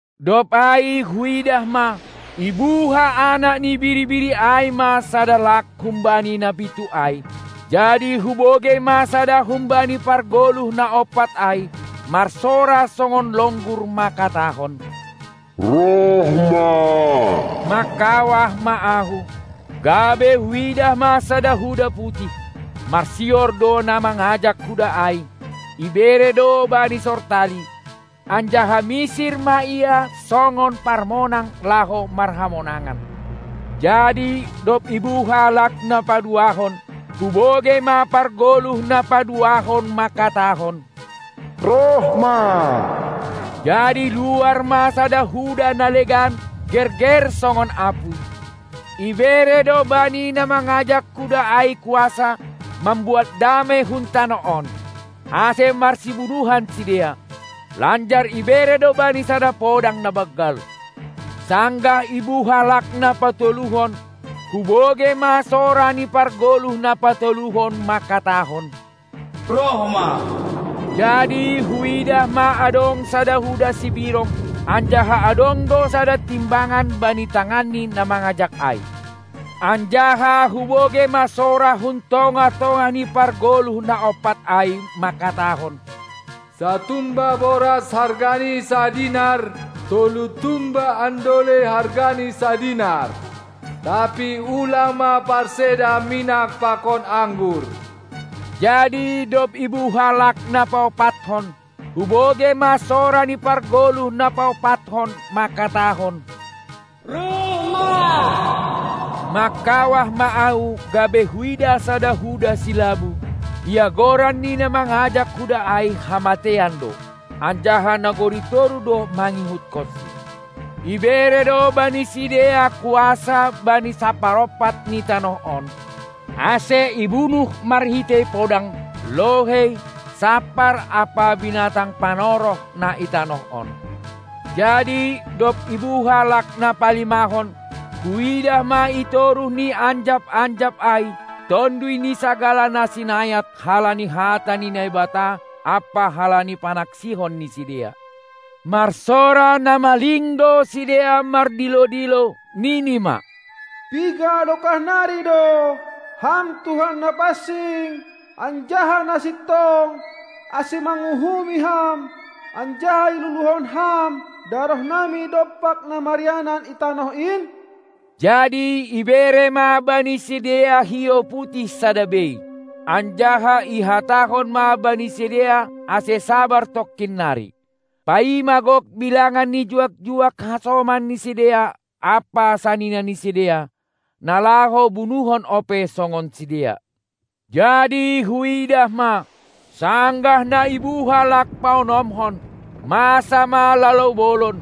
Dob ai huidah ma, ibuha Anak ni Biri-biri ai ma sada lak humbani na pitu ai. Jadi hubogei ma sada humbani pargoluh na ompat ai marsora songon longgur mangkatahon: Roh Ma! Mangkawah ma ahu, gabe huidah ma sada huda putih. Marsior do na mangajak huda ai, ibere do bani sortali, anjaha misir ma ia songon parmonang laho marhamonangan. Jadi dob ibuha lak na paduahon, hubogei ma pargoluh na paduahon mangkatahon: Roh ma! Jadi luar ma sada huda na legan, gerger songon apuy. Ibere do bani na mangajak huda ai kuasa mambuat damei hun tanoh on, ase marsibunuhan sidea; lanjar ibere do bani sada podang na banggal. Sanggah ibuha lak na patoluhon, hubogei ma sora ni pargoluh na patoluhon mangkatahon: Roh ma! Jadi huidah ma adong sada huda sibirong, anjaha adong do sada timbangan bani tangan ni na mangajak ai. Anjaha hubogei ma sora hun tongah-tongah ni pargoluh na ompat ai mangkatahon: Satumba boras hargani sadinar, tolu tumba andolei hargani sadinar! Tapi ulang ma parseda minak pakon anggur. Jadi dob ibuha lak na paompathon, hubogei ma sora ni pargoluh na paompathon mangkatahon: Roh ma! Mangkawah ma ahu gabe huidah sada huda silabu; ia goran ni na mangajak huda ai Hamateian do, anjaha nagori toruh do mangihutkonsi. Ibere do bani sidea kuasa bani saparompat ni tanoh on, ase ibunuh marhitei podang, lohei, sampar ampa binatang panoroh na i tanoh on. Jadi dob ibuha lak na palimahon, huidah ma itoruh ni anjap-anjap ai tonduy ni sagala na sinayat halani hata ni Naibata ampa halani panaksihon ni sidea. Marsora na maling do sidea mardilo-dilo, nini ma: Piga dokah nari do, Ham Tuhan na pansing anjaha na sintong, ase manguhumi Ham anjaha iluluhon Ham darohnami dompak na marianan i tanoh in? Jadi ibere ma bani sidea hiou putih sada bei, anjaha ihatahon ma bani sidea ase sabar tongkin nari, paima gok bilangan ni juak-juak hasoman ni sidea ampa sanina ni sidea, na laho bunuhon ope songon sidea. Jadi huidah ma, sanggah na ibuha lak na paonomhon, masa ma lalou bolon,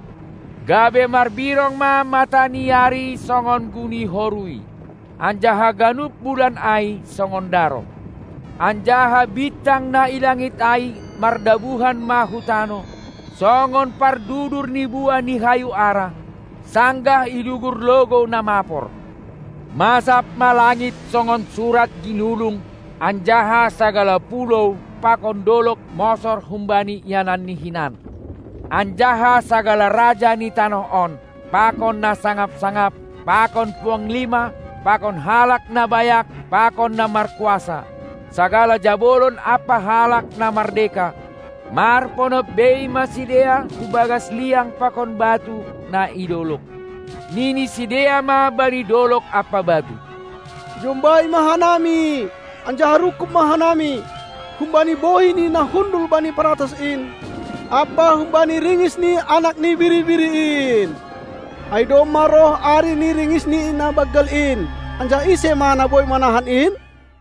gabe marbirong ma mata ni ari songon guni horuy anjaha ganup bulan ai songon daroh. Anjaha bintang na i langit ai mardabuhan ma hu tanoh, songon pardudur ni buah ni hayu ara, sanggah idugur logou na mapor. Masab ma langit songon surat ginulung, anjaha sagala pulou pakon dolog mosor humbani iananni hinan. Anjaha sagala raja ni tanoh on pakon na sangap-sangap pakon puanglima pakon halak na bayak pakon na markuasa, sagala jabolon ampa halak na mardeka, marponop bei ma sidea hubagas liang pakon batu na i dolog. Nini sidea ma bani dolog ampa batu: Jombai ma hanami anjaha rungkub ma hanami humbani bohi ni na hundul bani paratas in ampa humbani ringis ni Anak ni Biri-biri in, ai domma roh ari ni ringisni na banggal in; anjaha ise ma na boi manahan in?